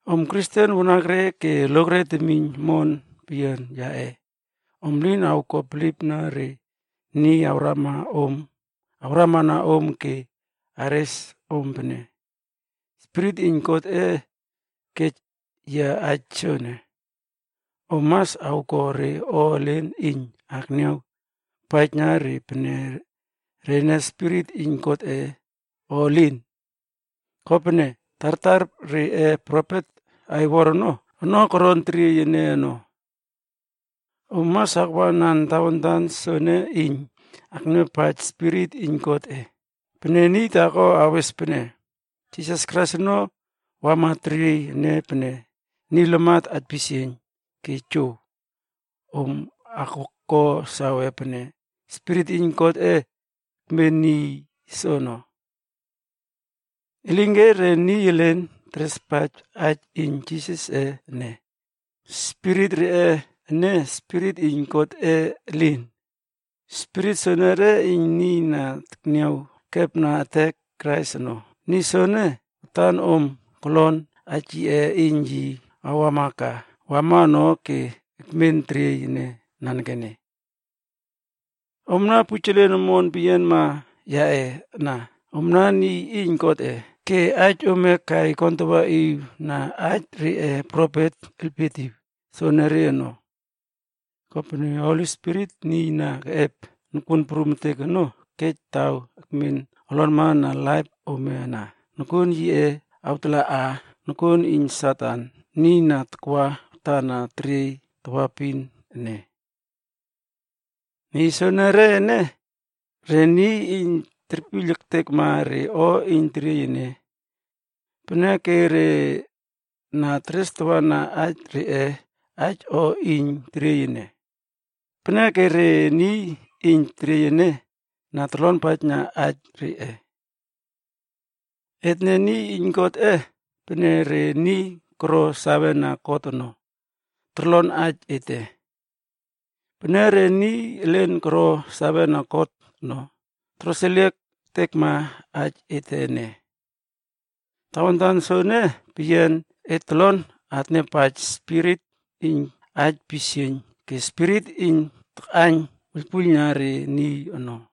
Om Kristen wanakre ke lokre temiyn omon peyianma yaꞌe, om lin awko bilipna re niy awramana om ke awres om pene, “Spirit iyn Godꞌe kej yia aij soene.” Om mas awko re o elen iyn akniaw akpaijna re pene rene spirit iyn Godꞌe o elin. Kopene, tartar reꞌe profet aiwor ono koron teriey ene ono. Om mas akwanan tawantan soene iyn akniawpaij Spirit iyn Godꞌe: pene niy taako awes pene, “Jisas Krais ono wama teriey ene pene niy lamat aipisieiyn” ke jow, om awko sawe pene, Spirit iyn Godꞌe ekmen niy soono. Elinke re niy elin terespaij aij iyn Jisasꞌe ene, spirit reꞌe ene, spirit iyn Godꞌe elin. Spirit soenere iyn niy na tekniaw ekepna ektek Krais ono. Niy soene, watan om kolon aij yiꞌe iyn yi awama ka, wama ono ke ekmen teriey ene nanekene. Omna pujelen omon peyianma yaꞌe ana, omna niy iyn Godꞌe ke aij ome kai kontawaꞌiwna aij reꞌe profet elpietiw soonore ono. Kopene Holi Spirit, niy na keꞌep nokuon prum ektek ono kej taw akmen olonma na laip ome ana, nokuon yiꞌe awtalaꞌa nokuon iyn Satan, niy na takwa watana teriey tawaepin ene. Niy soonore ene, re niy iyn terpiyl ektekma re o iyn teriey ene. Peneke re na terestawana aij reꞌe aij o iyn teriey ene. Peneke re niy iyn teriey ene na torlonpaijna aij reꞌe. Etne niy iyn Godꞌe, peneke re niy koro sawena God ono, torlon aij ete. Pene re niy elin koro sawena God ono, toroseliek ektekma aij ete ene. Tawantan soene peyian, et tolon atniawpaij Spirit iyn aij pisieiyn ke spirit iyn takꞌaiyn wuiylpuiylna re niy ono.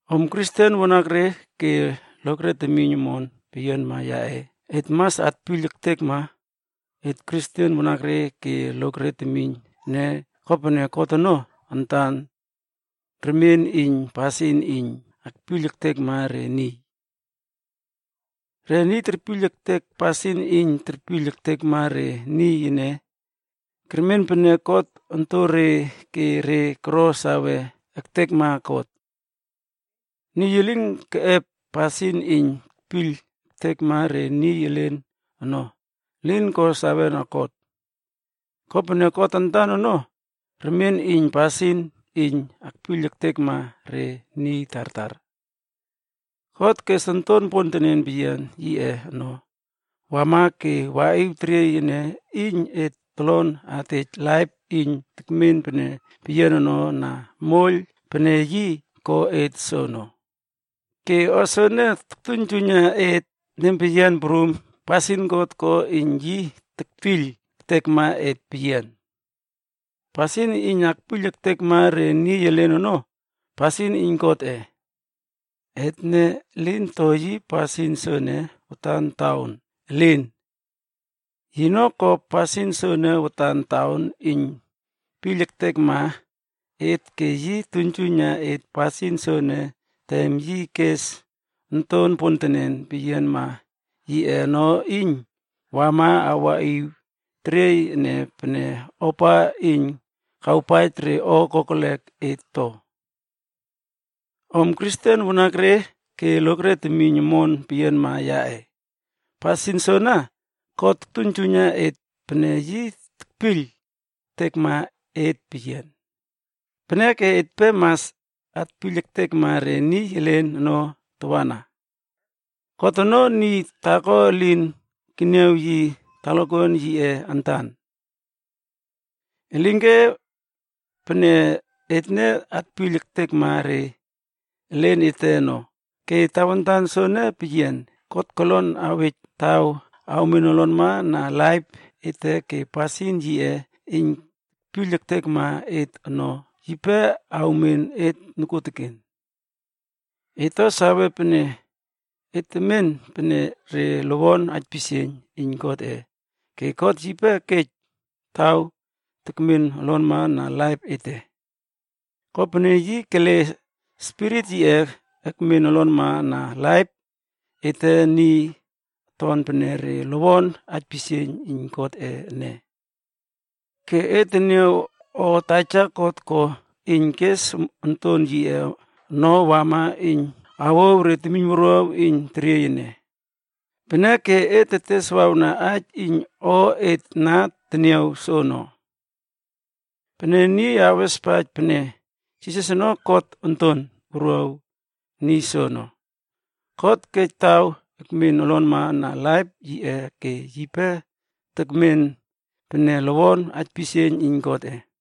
Om Kristen wanakre ke lokre temiyn omon peyianma yaꞌe, et mas atpiyl ektekma et Kristen wanakre ke lokre temiyn ene kopene God ono antan, remien iyn pasin iyn akpiyl ektekma re niy. Re niy terpiyl ektek pasin iyn terpiyl ektekma re niy ene, kermen pene God ontonre ke re koro sawe ektekna God. Niy elin keꞌep pasin iyn tekpiyl ektekma re niy elen ono, elin ko sawena God. Kopene God antan ono, remien iyn pasin iyn akpiyl ektekma re niy tartar. God kes Onton pontenen peyian yiꞌe ono wama ke waꞌiw teriey ene iyn et tolon atej laip iyn tekmen pene peyian ono na moiyl pene yi ko et soono. Ke o soene toktuiynjuiyna et nempeyian prum pasin God ko iyn yi tekpiyl ektekma et peyian. Pasin iyn akpiyl ektekma re niy elen ono, pasin iyn Godꞌe. Etne lin to yi pasin soene watan taon, elin! Yino ko pasin soene watan taon iyn piyl ektekma et ke yi tuiynjuiyna et pasin soene tem yi kes Onton pontenen peyianma yiꞌe ono iyn wama waꞌiw teriey ene pene ofa iyn kawpaij re o kokelek et to. Om Kristen wanakre ke lokre temiyn omon peyianma yaꞌe, pasin soene, God tuiynjuiyna et pene yi tekpiyl ektekma et peyian. Peneke etpe mas atpiyl ektekma re niy elen ono tawana. God ono, niy taako elin keniaw yi talakuan yiꞌe antan. Elinke pene etne atpiyl ektekma re elen ete ono, ke tawantan soene peyian, God kolon awej taw awmen olonma na laip ete ke pasin yiꞌe iyn tekpiyl ektekma et ono, yipe awmen et nokuoteken. Et to sawe pene et tetmen pene re lowon aipisieiyn iyn Godꞌe ke God yipe kej taw tekmen olonma na laip ete. Kopene yi kele Spirit yiꞌe ekmen olonmana na laip ete niy aton pene re lowon aipisieiyn iyn Godꞌe ene. Ke et teniaw o Taja God ko iyn kes Onton yiꞌe ono wama iyn awouw re temiynwuruaw iyn teriey ene. Peneke et teteswawna aij iyn o et na teniaw soono. Pene niy awespaij pene, “Jisas ono God Onton Wuruaw” niy soono, God kej taw ekmen olonma na laip yiꞌe ke yipe tekmen pene lowon aipisieiyn iyn Godꞌe.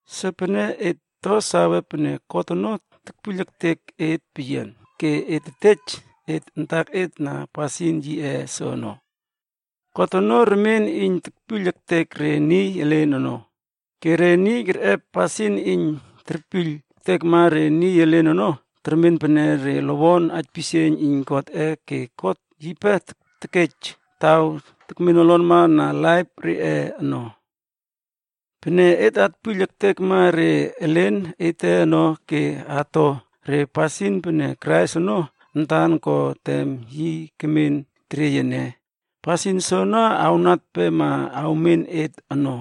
Sopeneke et to sawe pene God ono tekpiyl ektek et peyian, ke et tetej et antaket na pasin yiꞌe soene. God ono remien iyn terpiyl ektek re niy elen ono. Ke re niy kerꞌep pasin iyn terpiyl ektekma re niy elen ono termen pene re lowon aipisieiyn iyn Godꞌe ke God yipe tekej taw tekmen olonma na laip reꞌe ono. Pene et atpiyl ektekma re elen ete ono ke ato re pasin pene Krais ono antan ko tem yi kemen teriey ene, pasin soene awnatpema awmen et ono.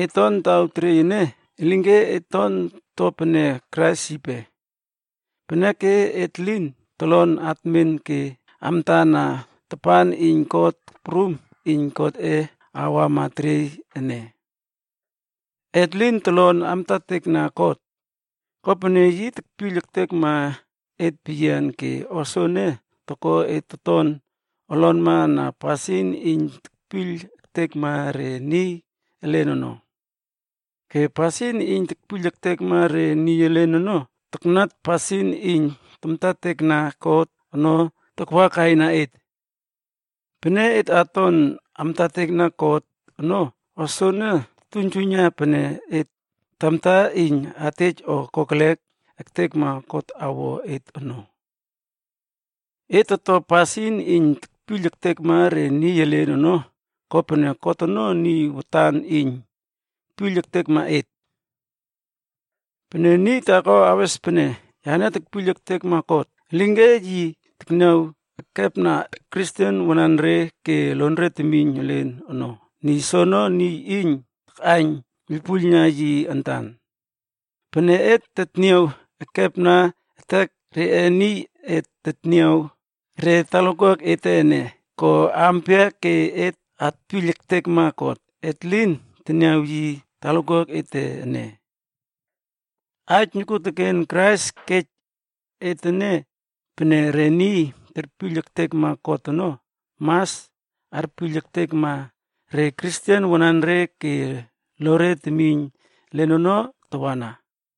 Et ton taw teriey ene, elinke et ton to pene Krais yipe. Peneke et lin tolon atmen ke amtana tapan iyn kot prum iyn Godꞌe awama teriey ene. Et lin tolon amtatekna God. Kopene yi tekpiyl ektekma et peyian ke o soene toko et toton olonma na pasin iyn tetpiyl ektekma re niy elen ono. Ke pasin iyn tetpiyl ektekma re niy elen ono, taknat pasin iyn tamtatekna God ono takwakaina et. Pene et aton amtatekna God ono, o soene toktuiynjuiyna pene et tamta iyn atej o kokelek ektekma God awo et ono. Et toto pasin iyn tetpiyl ektekma re niy elen ono kopene God ono niy watan iyn piyl ektekma et. Pene niy taako awes pene “Yane tekpiyl ektekma God,” elinke yi tekniaw ekepna Kristen wananre ke lonre temiyn elen ono, niy soono niy iyn takꞌaiyn wuiylpuiylna yi antan. Pene et tetniaw ekepna ektek re niy et tetniaw re talakuak ete ene, ko aampia ke et atpiyl ektekma God, et lin teniaw yi talakuak ete ene? Aij nokuoteken Krais kej et ene pene: Re niy terpiyl ektekma God ono mas arpiyl ektekma re Kristen wanare ke lore temiyn elen ono tawana.